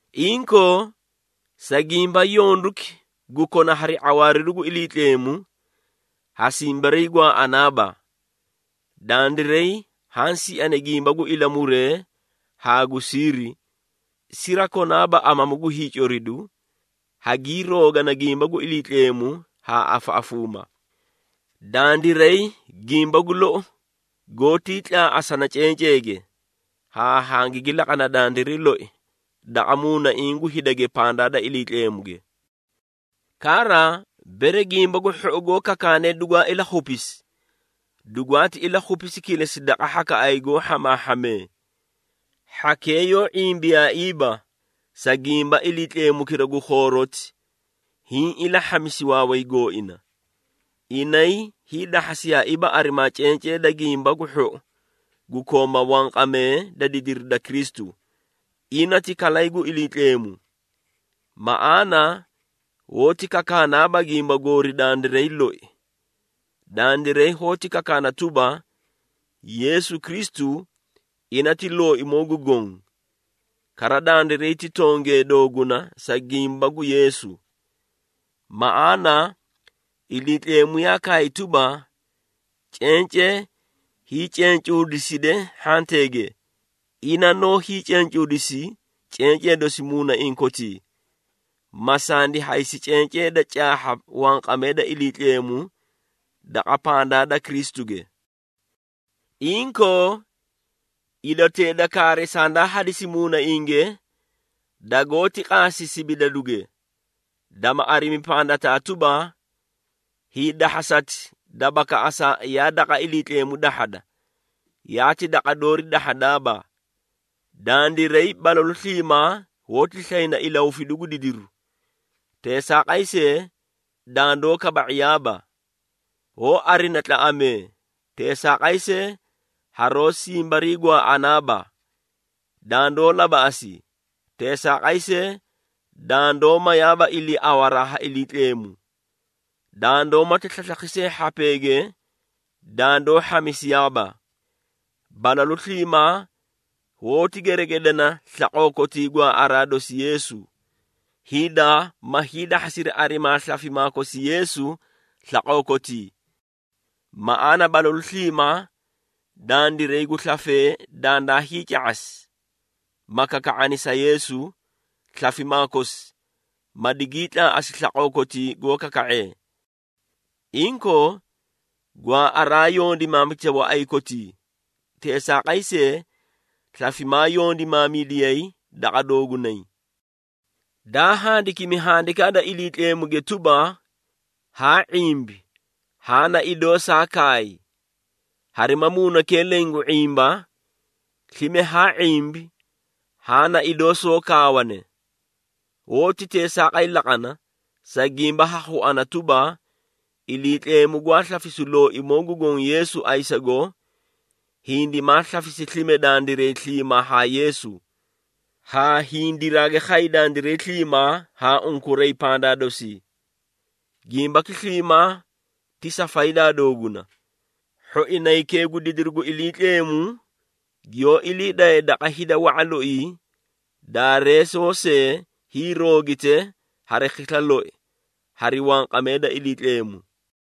Inkoo, sa gimba yonduki gu kona hari ⁄awaariru gu Iliitleemu, ha simbariigwaaꞌanaaba. Dandiray haã siani gimba gu ilamuree haa gu siiri, sirakonaaba amamu gu hiicoridu, hagii roogana gimba gu Iliitleemu haa afaꞌafuuma. Dandiray gimba gu lou goótii tlaaꞌasana cenceege, haa hangigi laqana dandiray loi daqa muunaiĩ gu hidage pandaa da Iliitleemuge. Kara, bere Gimba gu Hhou goó kakaane dugwaa ilakhupisi, dugwaati ilakhupisi kilesi daqa hhakaꞌay goó hhamaahhamee. Hhakee yoó ⁄imbiyaaiiba, sa gimba iliitleemukira gu khooroti, hiĩ ilahhamisi waaway gooina. Inay hiidahhasiyaaiiba arimaa cencee da Gimba gu Hhou gu kooma wanqamee da didiri da Kristu, ina ti kalay gu Iliitleemu. Maꞌaana hoóti kakaanaaba gimba goori dandiray loi. Dandiray hoóti kakaana tuba, Yeesu Kristu, ina ti Looimoo gu Goõ, kara dandiray ti tongee dooguna sa gimba gu Yeesu. Maꞌaana Iliitleemu yaa kaay tuba, “Cencee hiicencuudiside hhanteege.” Ina noó hiicencuudisi cencee dosi muunaiĩ kotii, ma sandi haysi cencee da caahha wanqamee da Iliitleemu daqa pandaa da Kristuge. Inkoo, idotee da kaari sandaa hadisi muunainge, dagoóti qaasi sibidaduge, dama arimi pandataa tuba, hiidahhasati da bakaꞌasa yaa daqa Iliitleemu dahhada, yaati daqa doori dahhadaaba. Dandiray balalu sliimaa hoóti slayna ilahufidu gu didiru, teesaaqay see, dandoó kaba⁄iyaaba. Hoó arina tlaꞌamee, teesaaqay see haroó simbariigwaaꞌanaaba. Dandoó labaꞌasi, teesaaqay see dandoó mayaaba iliiawaraa ha Iliitleemu. Dandoó mati slaslakhi see hhapeege, dandoó hhamisiyaaba. Balalu sliimaa hoóti geregedina slaqoo kotii gwaaꞌaraa dosi Yeesu, hida ma hiidahhasiri arimaa slafimaa kosi Yeesu slaqoo kotii. Maꞌaana balalu sliimaa, dandiray gu slafee dandaa hiica⁄asi, ma kaka⁄ani sa Yeesu, slafimaa kosi ma digii tlaaꞌasi slaqoo kotii goó kaka⁄ee. Inkoo, gwaaꞌaraa yondimaamita waꞌay kotii, teesaaqay see slafimaa yondimaamidiyay daqa doogunay. Daa handikimi Handikaa da Iliitleemuge tuba, “Haa ⁄imbi, haã na idoo saa kaay.” Harima muunakira leẽ gu ⁄imba, slime haa ⁄imbi haã na idoo soó kaawane. Hoóti teesaaqay laqana, sa gimba ha khuꞌuna tuba, Iliitleemu gwaa slafisu Looimoo gu Goõ Yeesu ayisago, hindimaa slafisi slime dandiray sliimaa haa Yeesu, haa hindiraagi khay dandiray sliimaa haa unkuray pandaa dosii. Gimbaki sliimaa ti sa faydaa dooguna, hhoinaykee gu didiru gu Iliitleemu giyoó ilii daye daqa hida wa⁄a loii, daareesoo see hiiroogite hari khisla loi, hari wanqamee da Iliitleemu.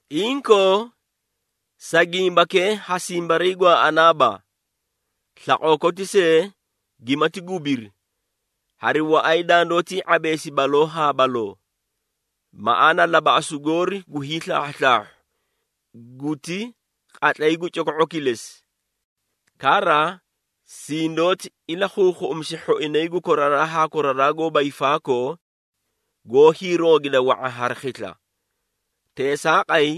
Inkoo, sa gimbakee ha simbariigwaaꞌanaaba. Slaqoo koti see gimati gubiri, hari waꞌay dandoótii ⁄abeesi baloo haa baloo. Maꞌaana labaꞌasu goori gu hiislaahhuslaahhu, guti qatlay gu coko⁄u kilesi. Kara, sindoóti ilakhuukhuꞌumisi hhoinay gu koraraa haa koraraa goóba hiifaakoo, goó hiiroogida wa⁄a hari khisla. Teesaaqay,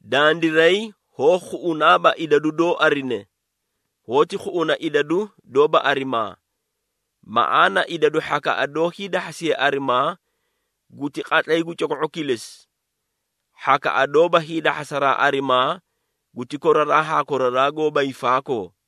dandiray hoó khuꞌunaaba idadu doó arine, hoóti khuꞌuna idadu doóba arimaa. Maꞌaana idadu hhakaꞌa doó hiidahhasiye arimaa guti qatlay gu coko⁄u kilesi. Hhakaꞌa doóba hiidahhasaraa arimaa guti koraraa haa koraraa goóba hiifaakoo.